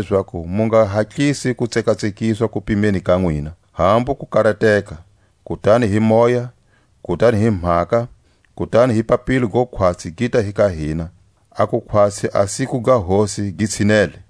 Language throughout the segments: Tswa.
lezaku mu nga hatlisi ku tsekatsekiswa kupimeni ka nwina, hambu ku karateka, kutani hi moya, kutani hi mhaka, kutani hi papilo go khwatsi gita hi ka hina, aku khwatsi a siku ga Hosi gi tshinele.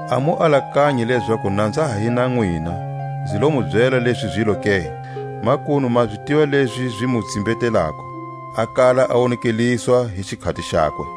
A mu alakanyi lezaku na nza ha hi na nwina, nzi lo mu byela lezi zilo ke? Makunu ma zi tiva lezi zi mu tsimbetelako, a kala a wonekeliswa hi xikhati xakwe.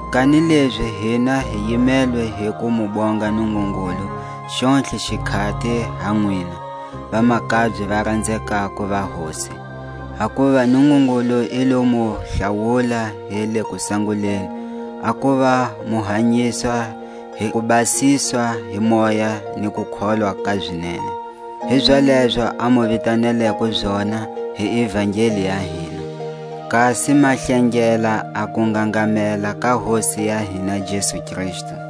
Kanilezi hina hi yimelwe hi ku mu bonga Nungungulu xontlhe xikhati ha nwina, vamakabye va ranzekako va Hosi; hakuva Nungungulu i lo mu hlawula hi le kusanguleni a kuva mu hanyiswa hi kubasiswa hi Moya ni kukholwa ka zinene. Hizalezo a mu vitaneleko zona hi ivangeli ya hina, kasi ma hlengela a kungangamela ka Hosi ya hina Jesu Kristu.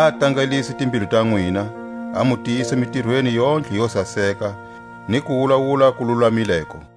a tangalise timbilu ta nwina, a mu tiyisa mitirweni yontlhe yo saseka ni kuwulawula ku lulamileko.